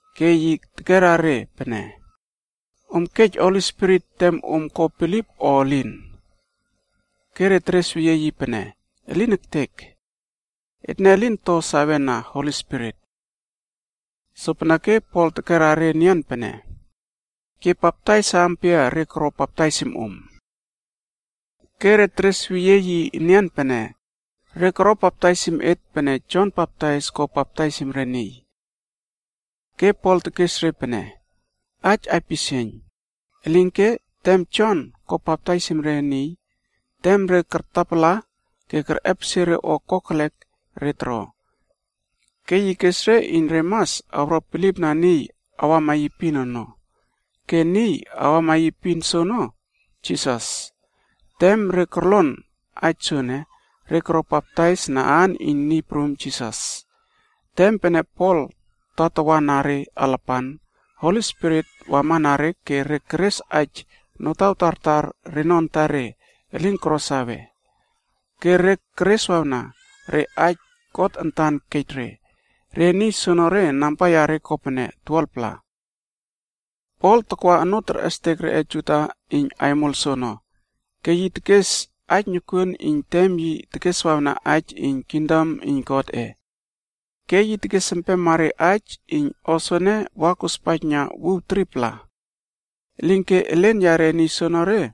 Ke yi tekera re pene, “Om kej Holi Spirit tem om ko bilip o elin?” Ke re teresweyie yi pene, “Elin ektek! Etne lin to sawena Holi Spirit.” Sopeneke Pol tekera re enian pene, “Ke baptais ampia re koro baptaisim om?” Ke re teresweyie yi enian pene, “Re koro baptaisim et pene Jon Baptais ko baptaisim re niy.” Ke Pol tekes re pene, “Aij aipisieiyn! Elinke, tem Jon ko baptaisim re niy, tem re kartapala ke kerꞌepesie re o kokelek re toro. Ke yi kes re iyn re mas awro bilipna niy awama yi epin ono. Ke niy awama yi epin soono, Jisas.” Tem re korlon aij soene, re koro baptais na aan iyn Niy Prum Jisas. Tem pene Pol tatawa na re alapan, Holi Spirit wamana re ke re keres aij notaw tartar reno antare elin koro sawe. Ke re kereswawna re aij God antan kej re. Re niy soonore namba yare kopene 12-pla. Pol takwa onoo terꞌestek reꞌe Juda iyn aimol soono, ke yi tekes aij nokuon iyn tem yi tekeswawna aij iyn kingdom iyn Godꞌe. Ke yi tekes empema re aij iyn o soene wa kospaijna wuw 3-pla. Elinke elen yare niy soonore,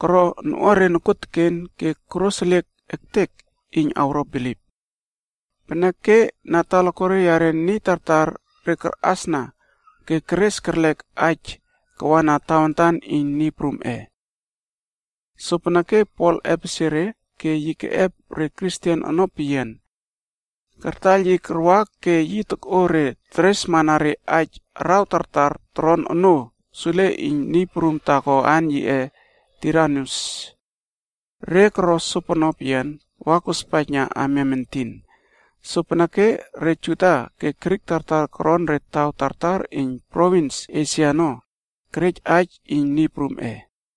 koro noꞌuare nokuoteken ke koroseliek ektek iyn awro bilip. Peneke na talakuare yare niy tartar re karꞌasna ke keres kerlek aij kawana Tawantan iyn Niy Prumꞌe.a Sopeneke Pol epesie re ke yi keꞌep re Kristen ono peyian kartaiyl yi karwa ke yi tokꞌo re teresmana re aij araw tartar toron onoo sule iyn niy prum taako aan yiꞌe, Tiranus. Re koro sopono peyian wa kospaijna amiam entin. Sopeneke re Juda ke Grik tartar koron re taw tartar iyn provins Esia ono kerej aij iyn Niy Prumꞌe.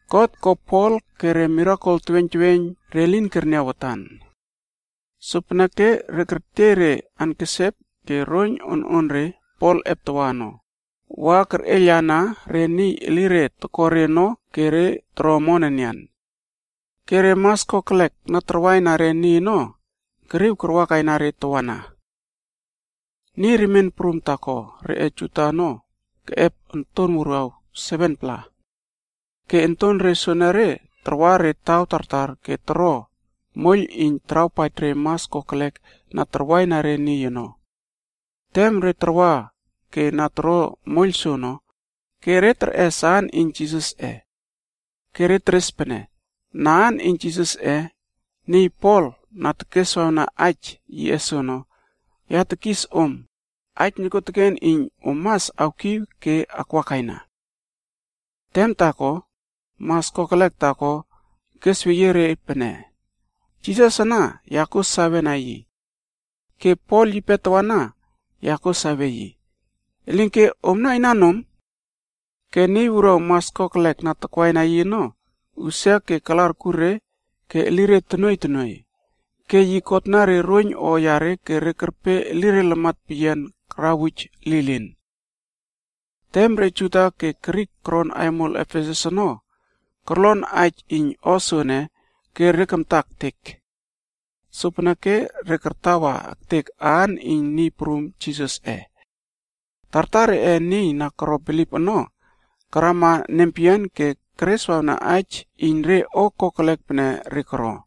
God ko Pol ko re mirakel teweiyn teweiyn re niy elin kerniaw watan. Sopeneke re niy kertiey re ankesep ke roiyn ononre Pol eptawa ono, wa kerꞌeiylana re niy elire tokore ono ke re toro omon enian. Ke re mas kokelek na tarwaina re niy ono, keriw karwakaina re tawana. Niy remien prumb taako reꞌe Juda ono keꞌep ontonre wuruaw 7-pla. Ke ontonre soenere tarwa re taw tartar ke toro moiyl iyn tarawpaij re mas kokelek na tarwaina re niy ono. Tem re tarwa ke na toro moiyl soono, ke re terꞌes aan iyn Niy Prum Jisas. Ke re teres pene, “Na aan iyn Jisasꞌe, niy Pol na tekeswawna aij yiꞌe soono ya tekis om aij nokuoteken iyn om mas awkiw ke akwakaina.” Tem taako, mas kokelek taako kesweyie re pene, “Jisas ana ya kuo sawena yi. Ke Pol yipe tawana ya kuo sawe yi. Elinke omna inan om?” Ke niy wuruaw mas kokelek na takwaina yi ono, usia ke kala arkur re ke elire tonuoiy tonuoiy. Ke yi kotna re roiyn o yare ke re kerpe elire lamat peyian karawuj lilin. Tem re Juda ke Grik koron aimol Efesus ono korlon aij iyn o soene, ke re kamta ektek. Sopeneke re kartawa ektek aan iyn Niy Prum Jisasꞌe. Tartar reꞌe niy na koro bilip ono karama nempeyian ke kereswawna aij iyn re o kokelek pene re koro.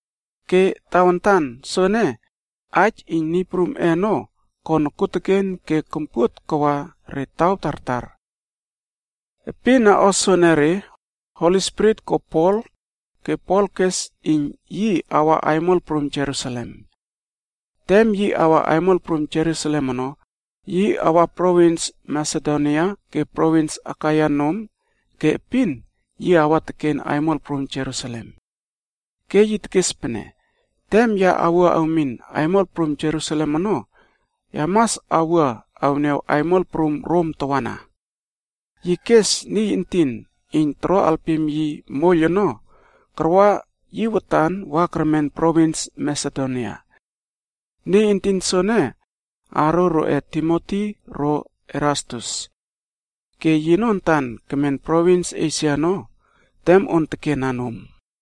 Ke tawantan soene, aij iyn Niy Prumꞌe ono ko nokuoteken ke kompuot kawa re taw tartar. Epin na o soenere, Holi Spirit ko Pol, ke Pol kes iyn yi awa aimol prum Jerusalem. Tem yi awa aimol prum Jerusalem ono, yi awa provins Masedonia ke provins Akaia nom ke epin yi awa teken aimol prum Jerusalem. Ke yi tekes pene, “Tem ya wua awmin aimol prum Jerusalem ono, ya mas awua awniaw aimol prum Rom tawana.” Yi kes niy entin iyn toro alpim yi moiyl ono, karwa yi watan wa kermen provins Masedonia. Niy entin soene, aaro roꞌe Timoti ro Erastus. Ke yino antan kemen provins Esia ono tem on tekena nom.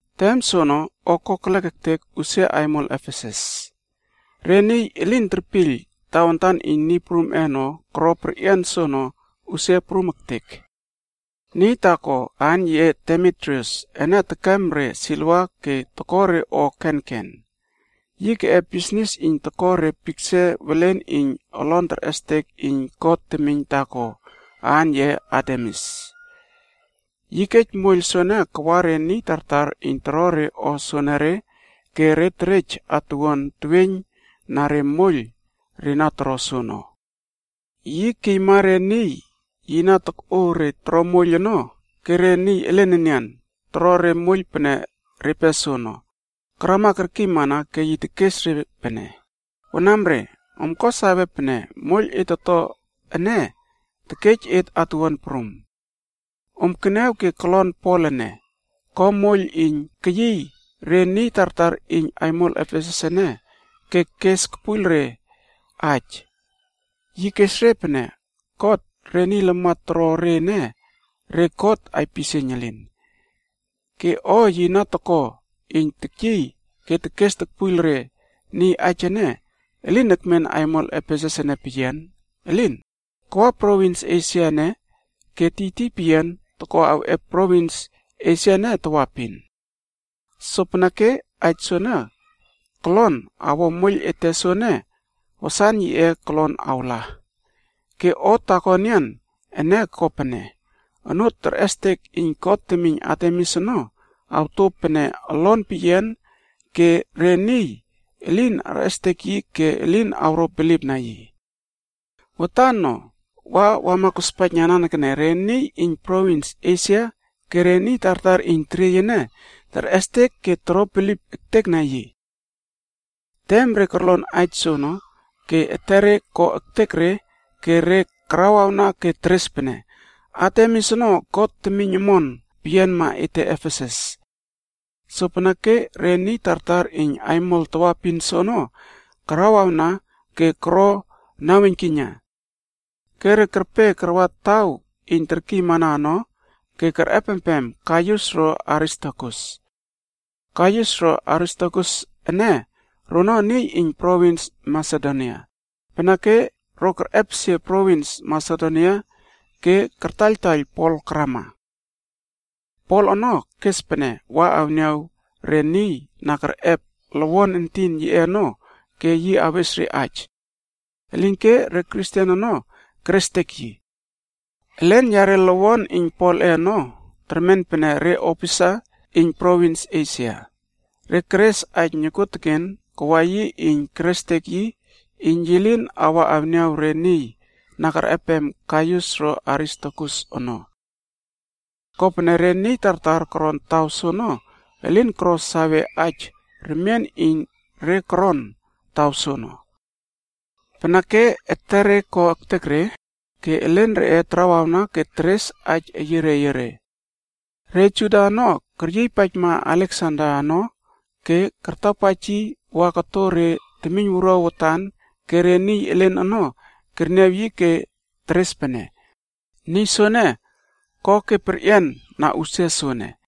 Tem soono o kokelek ektek usia aimol Efesus. Re niy elin terpiyl Tawantan iyn Niy Prumꞌe ono koro perꞌian soono usia prum ektek. Niy taako aan yiꞌe Demitrius ene tekem re siliva ke toko re o kenken. Yi keꞌep bisnis iyn toko re piksa welen iyn olon terꞌestek iyn god temiyn taako aan yiꞌe Artemis. Yi kej moiyl soene kawa re niy tartar iyn toro re o soenere ke re terej atuwuan teweiyn na re moiyl re na toro soono. Yi kiyma re niy yi na tokꞌo re toro moiyl ono ke re niy elen enian toro re moiyl pene repe soono, karama kerkiymana ke yi tekes re pene, “Wanamre, om ko sawe pene moiyl et toto ene terej et atuwuan prum. Om keniaw ke kolon Pol ene, ko moiyl iyn keyiy re niy tartar iyn aimol Efesus ene ke kes kepuiyl re aij. Yi kes re pene god re niy lamat toro re ene, re god aipisieiyn elin. Ke o yi na toko iyn tekyiy ke tekes tokpuiyl re niy aij ene, elin ekmen aimol Efesus ene peyian, elin, kawa provins Esia ene ke tiytiy peyian toko awꞌep provins Esia ene tawaepin. Sopeneke aij soene kolon awo moiyl ete soene, wasan yiꞌe kolon awla. Ke o taako enian ene ko pene, onoo terꞌestek iyn god temiyn Artemis ono awto pene olon peyian ke re niy elin arꞌestek yi ke elin awro bilipna yi. Watan no wa wama kospaijna nanekene, re niy iyn provins Esia ke re niy tartar iyn teriey ene terꞌestek ke toro bilip ektekna yi.” Tem re korlon aij soono ke etere ko ektek re ke re karawawna ke teres pene, “Artemis ono god temiyn omon peyianma ete Efesus.” Sopeneke re niy tartar iyn aimol tawaepin soono karawawna ke koro naweiynkiyna. Ke re kerpe karwa taw iyn terkiymana ono ke kerꞌepempem Gaius ro Aristarkus. Gaius ro Aristarkus ene, rono niy iyn provins Masedonia, peneke ro kerꞌepesie provins Masedonia ke kartaiyltaiyl Pol karama. Pol ono kes pene wa awniaw re niy na kerꞌep lowon entin yiꞌe ono ke yi awes re aij. Elinke re Kristen ono kerestek yi. Elen reꞌe lowon iyn Polꞌe ono termen pene re opisa iyn provins Esia. Re keres aij nokuoteken kawa yi iyn kerestek yi iyn yi lin awa awniaw re niy na kerꞌepem Gaius ro Aristarkus ono. Kopene re niy tartar koron taw soono elin koro sawe aij remien iyn re koron taw soono. Peneke, etere ko ektek re ke elen reꞌe tarawawna ke teres aij eyiere eyiere. Re Juda ono, keryiypaijma Aleksander ono ke kartapaij yi wa koto re temiyn wuruaw watan ke re niy elen ono kerniaw yi ke teres pene, niy soene ko ke perꞌian na usia soene.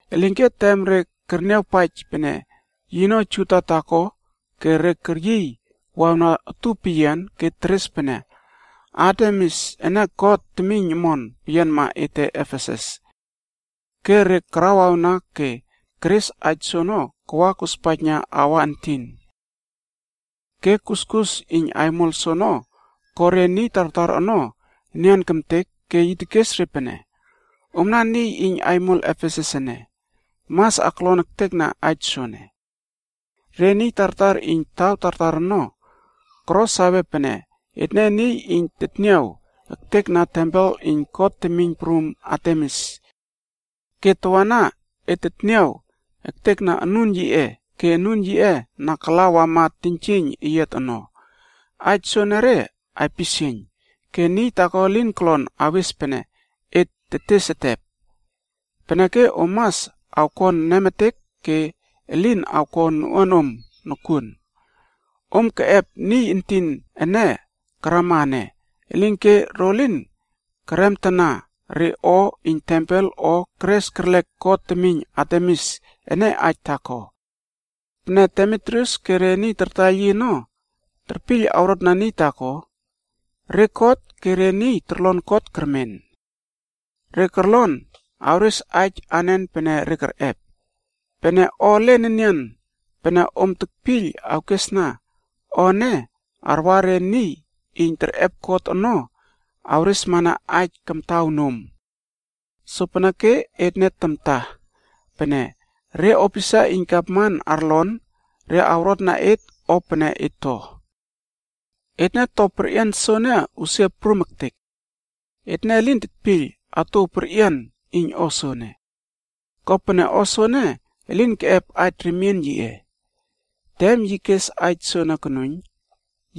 Elinke tem re kerniawpaij pene yino Juda taako ke re keryiy wawna utup peyian ke teres pene, “Artemis ene god temiyn omon peyianma ete Efesus.” Ke re karawawna ke keres aij soono kawa kospaijna aua entin. Ke kuskus iyn aimol soono ko re niy tartar ono nian kemtek ke yi tekes re pene, “Omna niy iyn aimol Efesus ene mas aklon ektekna aij soene. Re niy tartar iyn taw tartar ono, koro sawe pene etne niy iyn tetniaw ektekna tempel iyn god temiyn prum Artemis. Ke tawana, et tetniaw ektekna anun yiꞌe ke anun yiꞌe na kala wama teiynjieiyn eyiat ono. Aij soenere aipisieiyn, ke niy taako elin kolon awes pene et tetes etep. Peneke om mas awkon nemetek ke elin awko noꞌuanom nokuon. Om keꞌep niy entin ene karama ene, elinke ro lin keremtana re o iyn tempel o keres kerlek god temiyn ete Artemis ene aij taako. Pene Demitrius ke re niy tartaiyl yi ono terpiyl awrotna niy taako, re kot ke re niy torlon kot kermen. Re korlon awres aij anen pene re kerꞌep. Pene o elen enian pene om tekpiyl awkesna, o ene arwa re niy iyn terꞌep kot ono awresmana aij kamtaw nom. Sopeneke etne tamta, pene re opisa iyn gavman arlon, re awrotna et o pene et to. Etne to perꞌian soene usia prum ektek. Etne elin tetpiyl atouw perꞌian iyn o soene. Kopene o soene elin keꞌep aij remien yiꞌe.” Tem yi kes aij soene konuiyn,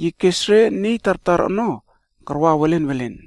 yi kes re niy tartar ono karwa welen welen.